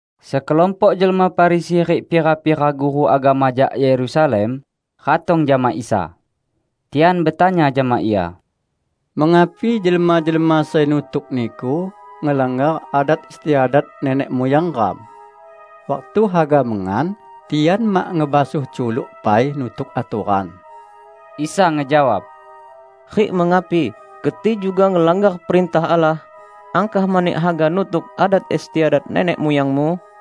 Sekelompok jelma Farisi rik pira-pira guru agama jak Yerusalem ratong jama Isa. Tian betanya jama Ia, "Mengapi jelma-jelma sai nutuk Niku ngelanggar adat istiadat nenek muyang neram? Waktu haga mengan, tian mak ngebasuh culuk pai nutuk atoran!" Isa ngejawab, "Rik mengapi keti juga ngelanggar perintah Allah, angkah mani haga nutuk adat istiadat nenek muyangmu?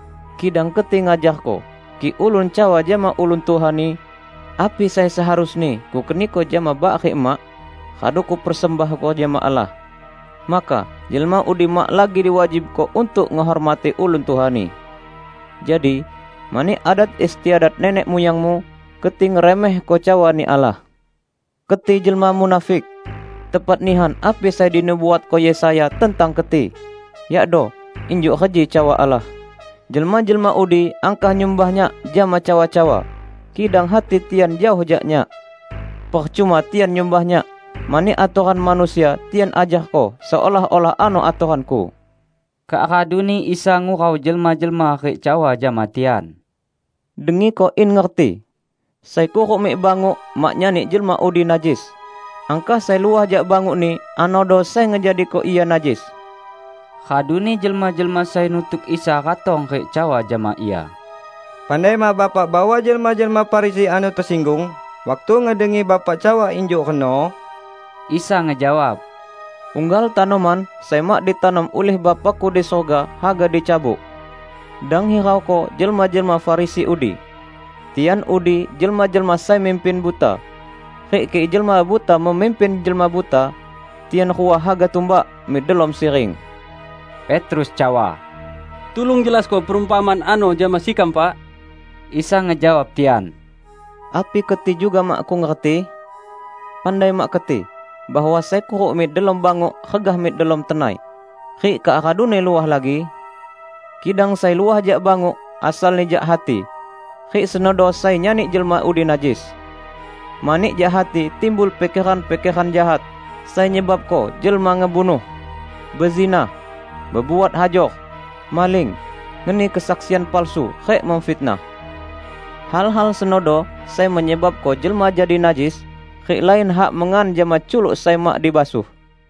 Kidang keti ngajarko: kik ulun cawa jama ulun tuhani, 'Api sai seharusni kukeniko jama bak rik emak, radu kupersembahko jama Allah,' maka jelma udi mak lagi diwajibko untuk ngehormati ulun tuhani. Jadi, mani adat istiadat nenek muyangmu, keti ngeremehko cawa-Ni Allah. Keti jelma munafik! Tepat nihan api sai dinubuatko Yesaya tentang keti, yakdo, 'Injuk reji cawa Allah: Jelma-jelma udi angkah nyumbah Nyak jama cawa-cawa, kidang hati tian jaoh jak Nyak. Percuma tian nyumbah Nyak, mani atoran manusia tian ajarko seolah-olah ano atoran-Ku.' " Kak raduni Isa ngurau jelma-jelma rik cawa jama tian, "Dengiko in ngerti! Sai kuruk mik banguk mak nyani jelma udi najis; angkah sai luah jak bangukni, anodo sai ngejadiko ia najis." Raduni jelma-jelma sai nutuk Isa ratong rik cawa jama Ia, "Pandai mak Bapak bahwa jelma-jelma Farisi ano tesinggung waktu ngedengi Bapak cawa injuk reno?" Isa ngejawab, "Unggal tanoman sai mak ditanom ulih Bapa-Ku di surga haga dicabut. Dang hirauko jelma-jelma Farisi udi. Tian udi jelma-jelma sai mimpin buta; rik kik jelma buta memimpin jelma buta, tian rua haga tumbak mik delom siring." Petrus cawa, "Tulung jelasko perumpamaan ano jama sekam, Pak!" Isa ngejawab tian, "Api keti juga makkung ngerti? Pandai mak keti, bahwa sai kuruk mik delom banguk regah mik delom tenai, rik kak raduni luah lagi? Kidang sai luah jak banguk, asalni jak hati; rik senodo sai nyani jelma udi najis. Mani jak hati timbul pikeran-pikeran jahat, sai nyebabko jelma ngebunuh, bezinah, bebuat hajor, maling, ngeni kesaksian palsu rik memfitnah. Hal-hal senodo sai menyebabko jelma jadi najis, rik lain hak mengan jama culuk sai mak dibasuh."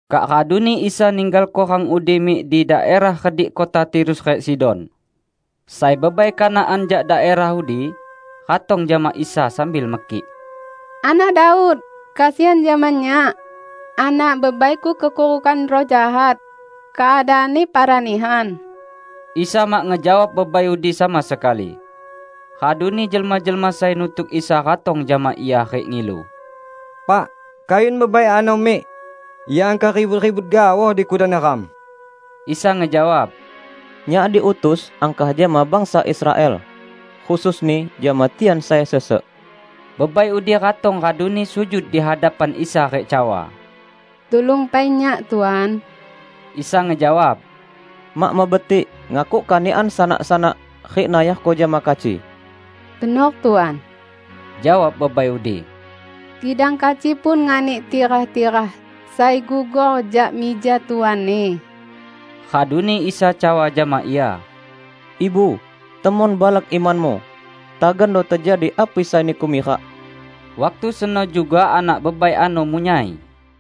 Kak raduni Isa ninggalko rang udi mik di daerah redik kota Tirus rik Sidon. Sai bebai Kanaan jak daerah udi, ratong jama Isa sambil mekik, "Anak Daud, kesian jama nyak! Anak bebaiku kekurukan ruh jahat. Keadaanni parah nihan." Isa mak ngejawab bebai udi sama sekali. Raduni jelma-jelma sai nutuk Isa ratong jama Ia rik ngilu, "Pak, kayun bebai ano mik. Ia angkah ribut-ribut gaoh di kudan neram!" Isa ngejawab, "Nyak diutus angkah jama bangsa Israel, khususni jama tian sai sesek." Bebai udi ratong raduni sujud di hadapan Isa rik cawa, "Tulung pai nyak, Tuan." Isa ngejawab, "Mak mebetik ngakuk kanikan sanak-sanak rik nayarko jama kaci." "Benor, Tuan," jawab bebai udi, "kidang kaci pun nganik tirah-tirah sai gugor jak mija tuanni." Raduni Isa cawa jama ia, "Ibu, temon balak imanmu! Tagando tejadi api sai niku mirak!" Waktu seno juga anak bebai ano munyai.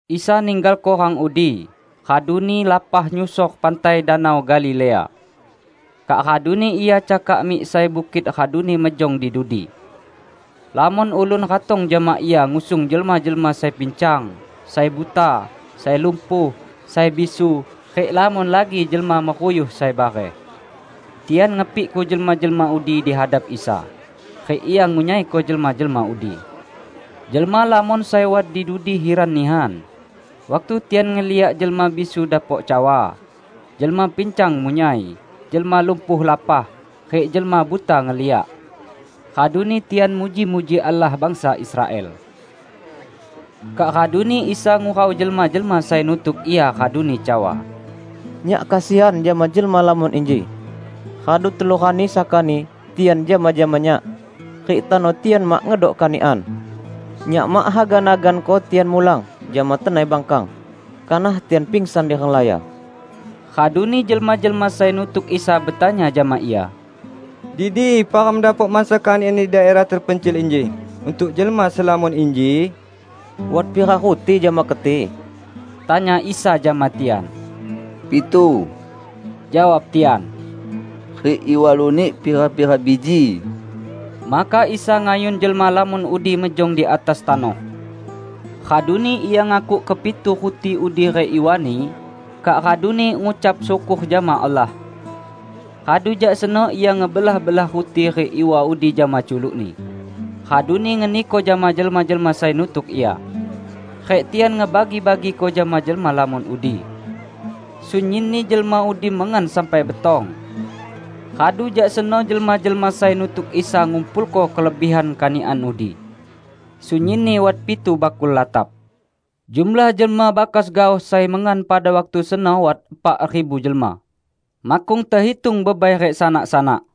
Isa ninggalko rang udi, raduni lapah nyusor pantai Danau Galilea. Kak raduni Ia cakak mik sai bukit raduni mejong di dudi. Lamon ulun ratong jama Ia ngusung jelma-jelma sai pincang, sai buta, sai lumpuh, sai bisu, rik lamon lagi jelma meruyuh sai bareh. Tian ngepikko jelma-jelma udi dihadap Isa, rik Ia ngunyaiko jelma-jelma udi. Jelma lamon sai wat di dudi hiran nihan, waktu tian ngeliak jelma bisu dapok cawa, jelma pincang munyai, jelma lumpuh lapah, rik jelma buta ngeliak. Raduni tian muji-muji Allah bangsa Israel. Kak raduni Isa ngurau jelma-jelma sai nutuk Ia raduni cawa, "Nyak kesian jama jelma lamon inji. Radu telu rani sakani tian jama-jama Nyak, rik tano tian mak ngedok kanikan. Nyak mak haga naganko tian mulang jama tenai bangkang, kanah tian pangsan di renglaya." Raduni jelma-jelma sai nutuk Isa betanya jama Ia, "Di dipa ram dapok mansa kanikan di daerah tepencil inji untuk jelma selamon inji?" "Wat pira ruti jama keti?" tanya Isa jama tian. "Pitu," jawab tian, "rik iwa lunik pira-pira biji." Maka Isa ngayun jelma lamon udi mejong di atas tanoh. Raduni Ia ngakuk kepitu ruti udi rik iwani, kak raduni ngucap syukor jama Allah. Radu jak seno Ia ngebelah-belah ruti rik iwa udi jama culuk-Ni, raduni ngeniko jama jelma-jelma sai nutuk Ia. Rik tian ngebagi-bagiko jama jelma lamon udi. Sunyinni jelma udi mengan sampai betong. Radu jak seno jelma-jelma sai nutuk Isa ngumpulko kelebihan kanikan udi. Sunyinni wat pitu bakul latap. Jumlah jelma bakas gaoh sai mengan pada waktu seno wat epak ribu jelma, makkung tehitung bebai rik sanak-sanak.